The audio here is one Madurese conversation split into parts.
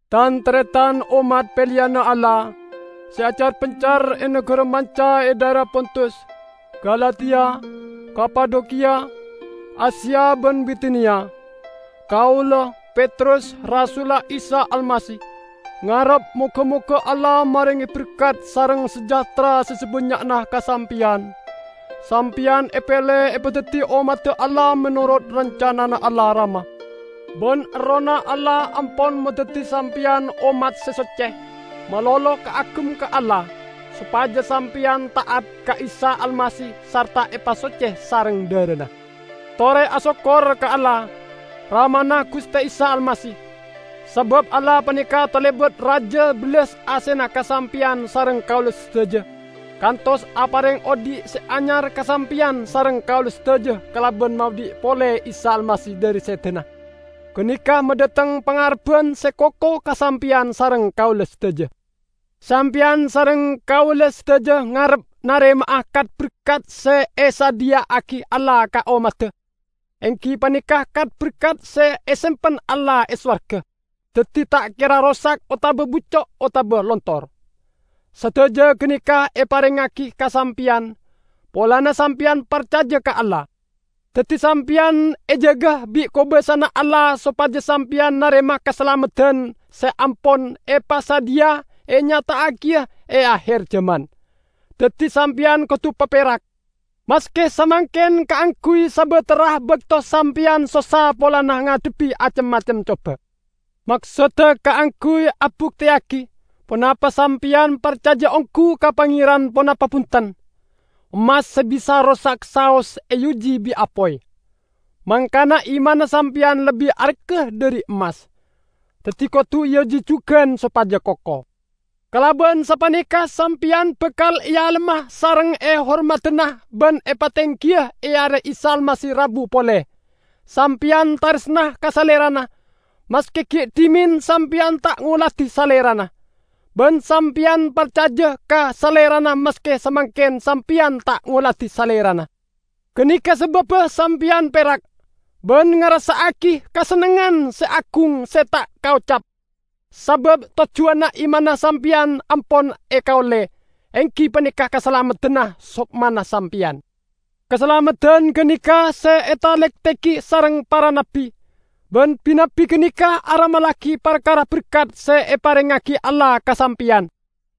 Tan-taretan ommat peleyanna Allah, se acar-pencar e nagara manca e dhaera Pontus, Galatia, Kapadokiya, Asia ban Bitiniya! Kaula, Petrus, rasulla Isa Almasih, ngarep moga-moga Allah marenge berkat sareng sejahtera se sabannya'na ka sampeyan. Sampeyan epele epadaddi ommadda Allah menorot rancanana Allah Rama. Ban Errohna Allah ampon madaddi sampeyan ommat se socce, malolo kaagem ka Allah, sopaja sampeyan ta'at ka Isa Almasih sarta epasocce sareng dharana. Tore asokkor ka Allah, Ramana Guste Isa Almasih! Sabab Allah paneka talebat raja bellas asena ka sampeyan sareng kaula sadaja, kantos apareng odhi' se anyar ka sampeyan sareng kaula sadaja kalaban maodhi' pole Isa Almasih dhari sedana. Ganeka madhateng pangarebban se koko ka sampeyan sareng kaula sadaja. Sampeyan sareng kaula sadaja ngarep narema'a kat-berkat se esadhiya'agi Allah ka ommadda, enggi paneka kat-berkat se esempen Allah e sowarga, daddi ta' kera rosak otaba bucco' otaba lontor. Sadaja ganeka eparengngagi ka sampeyan, polana sampeyan parcaja ka Allah. Daddi sampeyan ejaga bi' kobasana Allah sopaja sampeyan narema kasalameddan se ampon epasadhiya enyata'agiya e aher jaman. Daddi sampeyan kodu paperak, maske samangken kaangguy sabatara bakto sampeyan sossa polana ngadhebbi acem-macem coba. Maksodda kaangguy abukteyagi ponapa sampeyan parcaja onggu ka Pangeran ponapa bunten. Emmas se bisa rosak saos eoji bi' apoy. Mangkana imanna sampeyan lebbi arga dhari emmas, daddi kodu eoji jugan sopaja koko. Kalaban sapaneka sampeyan bakal ealemma sareng ehormadana ban epatenggiya e are Isa Almasih rabu pole. Sampeyan taresna ka Salerana, maske gi' dhimen sampeyan ta' ngoladi Salerana. Ban sampeyan parcaja ka Salerana maske samangken sampeyan ta' ngoladi Salerana. Ganeka sababba sampeyan perak, ban ngarassa'agi kasennengngan se agung se ta' kaocap. Sabab tojjuwanna imanna sampeyan ampon ekaolle, enggi paneka kasalameddanna sokmana sampeyan. Kasalameddan ganeka se etalektegi sareng para nabbi; ban bi-nabbi ganeka aramallagi parkara berkat se eparengngagi Allah ka sampeyan.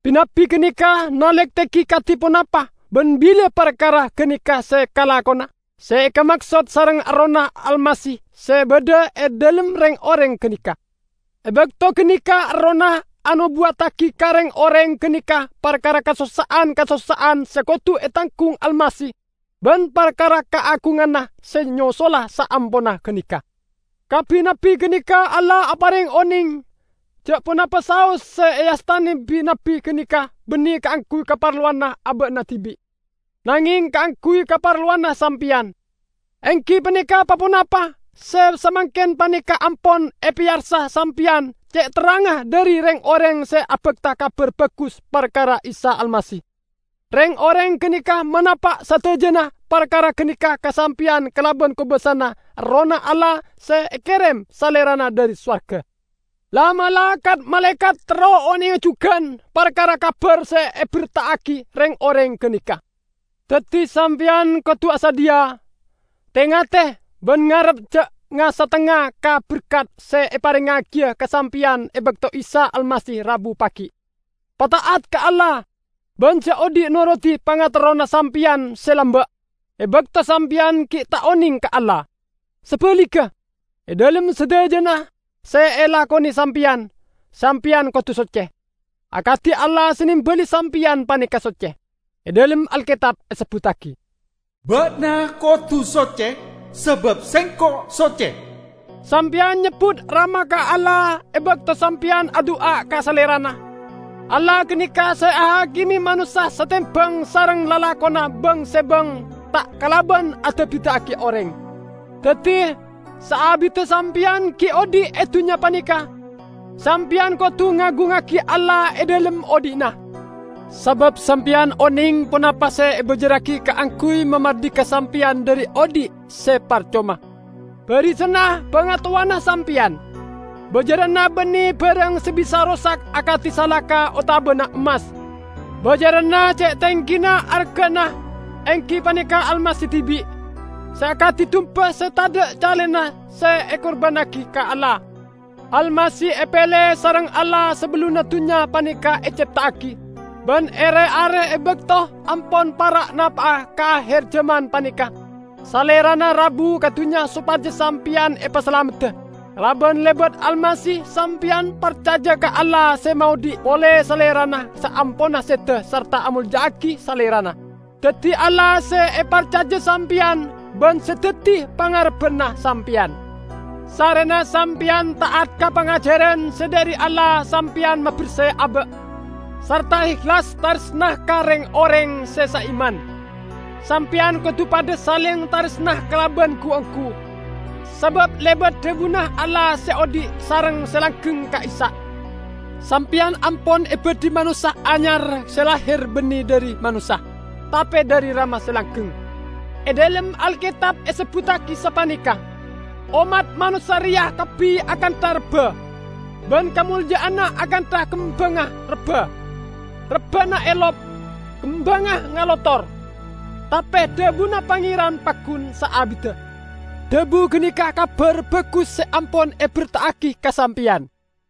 Bi-nabbi ganeka nalektegi kadi ponapa ban bila parkara ganeka se kalakona, se ekamaksod sareng Errohna Almasih se badha e dhalem reng-oreng ganeka. E bakto ganeka Errohna anobuwattagi ka reng-oreng ganeka parkara kasossa'an-kasossa'an se kodu etanggung Almasih ban parkara kaagunganna se nyosola saamponna ganeka. Ka bi-nabbi ganeka Allah apareng oneng ja' ponapa saos se eastane bi-nabbi ganeka banne kaangguy kaparlowanna aba'na dibi', nangeng kaangguy kaparlowanna sampeyan, enggi paneka pa-ponapa se samangken paneka ampon epeyarsa sampeyan ce' terrangnga dhari reng-oreng se abakta Kabar Bagus parkara Isa Almasih. Reng-oreng ganeka manapa' sadajana parkara ganeka ka sampeyan kalaban kobasana Errohna Allah se ekerem Salerana dhari sowarga. La'-mala' kat-malaekat terro onenga jugan parkara kabar se eberta'agi reng-oreng ganeka. Daddi sampeyan kodu asadhiya. Te-ngate, ban ngarep ja' nga-satengnga ka berkat se eparengngagiya ka sampeyan e bakto Isa Almasih rabu pagi'. Pata'at ka Allah, ban ja' odhi' norodi pangaterrona sampeyan se lamba', e bakto sampeyan gi' ta' oneng ka Allah. Sabaligga, e dhalem sadajana se elakone sampeyan, sampeyan kodu socce, akadi Allah se nembali sampeyan paneka socce. E dhalem Alketab esebbuttagi, "Ba'na kodu socce, sabab Sengko' socce." Sampeyan nyebbut Rama ka Allah e bakto sampeyan adu'a ka Salerana. Allah ganeka se ahakime manossa satembang sareng lalakonna bang-sebang ta' kalaban ada'-bida'agi oreng. Daddi, saabidda sampeyan gi' odhi' e dunnya paneka, sampeyan kodu ngagungngagi Allah e dhalem odhi'na. Sabab sampeyan oneng ponapa se ebajarragi kaangguy mamardika sampeyan dhari odhi' se parcoma, barisanna bangatowana sampeyan. Bajaranna banne barang se bisa rosak akadi salaka otabana emmas, bajaranna ce' tenggina argana, enggi paneka Almasih dibi', se akadi dumba se tadha' calena se ekurbannagi ka Allah. Almasih epele sareng Allah sabellunna dunnya paneka ecepta'agi. Ban e re-are e bakto ampon para' napa'a ka aher jaman paneka, Salerana rabu ka dunnya sopaja sampeyan epasalamedda. Kalaban lebat Almasih sampeyan parcaja ka Allah se maodhi' pole Salerana saamponna seda sarta amolja'agi Salerana. Daddi Allah se eparcaja sampeyan, ban se daddi pangarebbanna sampeyan. Sarrena sampeyan ta'at ka pangajaran se dhari Allah sampeyan maberse aba', sarta ehlas taresna ka reng-oreng se saiman, sampeyan kodu padha saleng taresna kalaban gu-onggu. Sabab lebat dhabuna Allah se odhi' sareng se langgeng ka'issa', sampeyan ampon ebadhi manossa anyar se lahir banne dhari manossa, tape dhari Rama se langgeng. E dhalem Alketab esebbuttagi sapaneka, "Ommat manossa reya kabbi akantha rebba, ban kamolja'anna akantha kembangnga rebba. Rebbana elop, kembangnga ngalotor; tape dhabuna Pangeran paggun saabidda." Dhabu ganeka Kabar Bagus se ampon eberta'agi ka sampeyan.